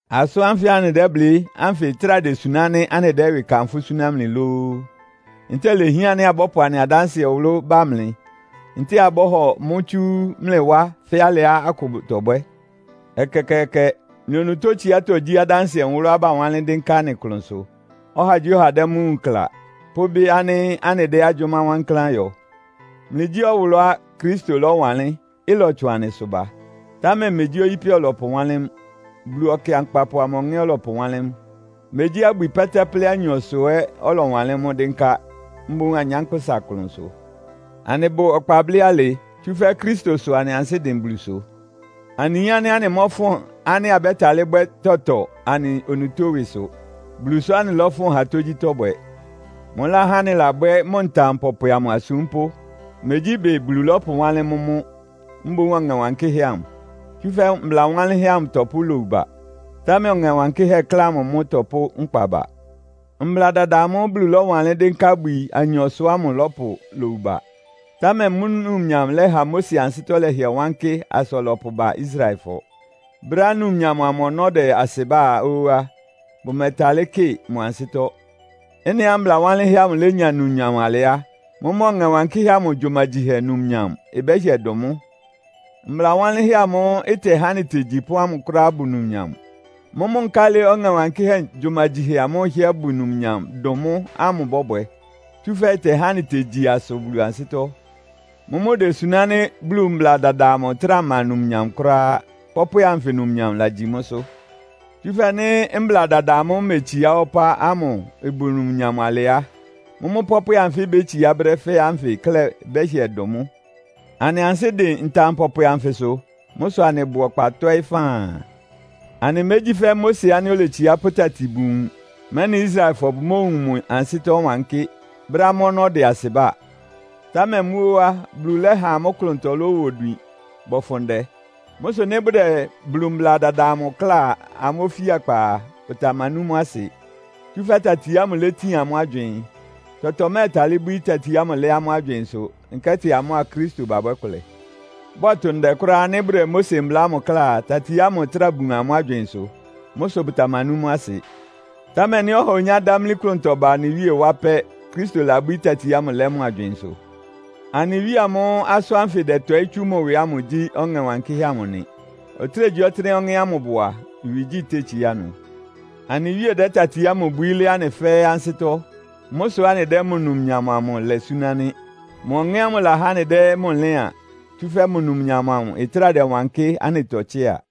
Asʋ́n ánfɩ anɩdɛ́blɩ́ ánfɩ ɩtráa desuná ánɩ́ anɩdɛ́ ɩwɩ kanfʋ́ súná mlɩ lóó? Ntɛ́ɛ ilehián ánɩ́ abɔ́pʋ anɩ adánsɩɛ nwʋlʋ́ bá mlɩ, ntɛ́ɛ abɔ́hɔ mʋ́ tsú mlɩ wá fɛ́ alɩá akʋ bʋtɔbwɛ́? Ɛkɛkɛɛkɛ! Mlɩ onutó tsiátɔ́ gyí adánsɩɛ nwʋlʋ́á bawánlɩ́n dɩ́nká anɩ klʋnsʋ, ɔhagyíɔha dɛ́ mʋ́ wúun kla, pʋ́bɩ́ ánɩ́ anɩdɛ́ agyʋ́má wankláán yɔ. Mlɩgyí ɔwʋlʋ́á Kristo lɔ́wanlɩ́n, ɩlɔtsʋn anɩsʋ ba. Támɛ megyí oyípɛ ɔlɔpʋwánlɩ́n mʋ́, Bulu Ɔkɩankpapʋ amʋ Ɔŋɛ́ ɔlɔpʋwánlɩ́n mʋ́. Megyí abwi pɛ́tɛ́plɛ́ anyɔsʋ ɛ́ ɔlɔwanlɩ́n mʋ́ dɩ́nká, mboún anyánkpʋ́sa klʋnsʋ. Anɩbʋ ɔkpa blɩ́ alɩ, tsúfɛ́ Kristo sʋ anɩ ansɩ́ dɩn Bulusʋ. Anɩyin ánɩ́ anɩmɔ́fʋn ánɩ́ abɛ́talɩ́ bwɛ́ tɔtɔ anɩ onutó ɩwɩsʋ. Bulu sʋ́ anɩlɔ́fʋn ha tógyítɔ́ bwɛ. Mʋláhá anɩlabwɛ́ mʋ ntam pɔpwɛ amʋ asúmpʋ́. Megyí ɩbɩ Bulu lɔ́pʋwánlɩ́n mʋ́ mʋ́, mboún Ɔŋɛ Wankɩ́hɛ́ amʋ. Tsúfɛ́ mbla wanlɩ́nhɛ́ amʋ ɩtɔpʋ́ lowu ba, támɛ Ɔŋɛ Wankɩ́hɛ́ klɛ́ amʋ mʋ́ ɩtɔpʋ́ nkpa ba. Mbla dada amʋ́ʋ́ Bulu lɔ́wanlɩ́n dɩ́nká abwi anyɔsʋ ámʋ ɩlɔpʋ lowu ba. Támɛ mʋ́ numnyam lɛ́ha Mose ansɩ́tɔ́ lɛhɩɛ wankɩ́ asa ɔlɔpʋba Israelfɔ. Brɛ́á numnyam amʋ ɔnɔ́ ɩdɛ asɩbá ó á, bʋmɛtalɩ́ kɩ mʋ ansɩ́tɔ́. Ɩ́nɩá mbla wanlɩ́nhɛ́ amʋ lénya numnyam alɩ á, mʋ́mʋ́ Ɔŋɛ Wankɩ́hɛ́ amʋ gyumagyihɛ numnyam ɩbɛ́hɩɛ dʋn mʋ́! Mbla wanlɩ́nhɛ́ amʋ́ʋ́ ɩtɛhá anɩtegyi ɩpɔ́n ámʋ kʋ́ráá ɩbʋ numnyam. Mʋ́mʋ́ nkálɩ Ɔŋɛ Wankɩ́hɛ́ gyumagyihɛ amʋ́ʋ́ ɩhɩ́ɛ́ bʋ numnyam dʋn mʋ́ ámʋ ɩbɔ́bwɛ? Tsúfɛ́ ɩtɛhá anɩtegyi asʋ Bulu ansɩ́tɔ́! Mʋ́mʋ́ idesuná ánɩ́ Bulu mbla dada amʋ ɩtráa ma numnyam kʋ́ráá. Pɔ́pwɛ anfɩ numnyam lagyi mʋ́sʋ́. Tsúfɛ́ nɩ́ Mbla dada amʋ́ʋ́ imetsiá wá ɔpá ámʋ ɩbʋ numnyam alɩ á, mʋ́mʋ́ pɔ́pwɛ anfɩ́ ibétsiá brɛ́ fɛ́ɛ́ ánfɩ klɛ́ ɩbɛ́hɩɛ dʋn mʋ́! Anɩ ansɩ́ dɩn ntam pɔpwɛ anfɩsʋ. Mʋ́ sʋ anɩbʋ ɔkpa tɔ́ɩ́ faan. Anɩmégyí fɛ́ Mose ánɩ́ oletsiá pʋ́ tati bun nwun, mɛ́nɩ Israelfɔ bʋmóowun mʋ ansɩ́tɔ́ wankɩ́, brɛ́á mʋ́ ɔnɔ́ ɩdɛ asɩbá. Támɛ mʋ́ óó á, Bulu lɛ́ha amʋ́ klʋntɔ lɔ́wa odwin bɔfʋn ndɛ. Mʋ́ sʋ nɩ́ bʋdɛ Bulu mbla dada amʋ kláa amʋ́ ofíakpa a, bʋtamanú mʋ́ asɩ, tsúfɛ́ tati ámʋ létin amʋ́ agywɩɩn. Tɔtɔ mɛ́ɛtalɩ́ bwíí tati ámʋ lɛ́ amʋ́ agywɩɩnsʋ, nkɛ́tɩ amʋ́a Kristo babwɛ́ kʋlɛ. Bɔ́tʋ ndɛ kʋ́ráá nɩ́ bʋdɛ Mose mbla ámʋ kláa a, tati ámʋ ɩtráa bun amʋ́ agywɩɩnsʋ. Mʋ́ sʋ bʋtamanú mʋ́ asɩ. Támɛ nɩ́ ɔha onyá dámlí klʋntɔ ba anɩ Wíe wá pɛ́, Kristo labwíí tati ámʋ lɛ́ mʋ agywɩɩnsʋ. Anɩ Wíe amʋ́ʋ́ asʋ́n ánfɩ ɩdɛtɔɩ́ tsú mʋ ɩwɩ ámʋ gyí Ɔŋɛ́ Wankɩ́hɛ́ amʋ nɩ. Ɔtɩ́nɛgyíɔtɩ́nɛ́á Ɔŋɛ́ ámʋ ɩbʋ a, ɩwɩgyí tétsíá ɩnʋ. Anɩ Wíe dɛ́ tati ámʋ bwií lɛ́ anɩ fɛ́ɛ́ ansɩ́tɔ́. Mʋ́ sʋ́ anɩdɛ́ mʋ numnyam amʋ lɛ súná nɩ́. Mʋ Ɔŋɛ́ ámʋ lahá anɩdɛ́ mʋ lɩ́an, tsúfɛ́ mʋ numnyam amʋ ɩtráa dɛwankɩ́ anɩtɔ tsɩ́a.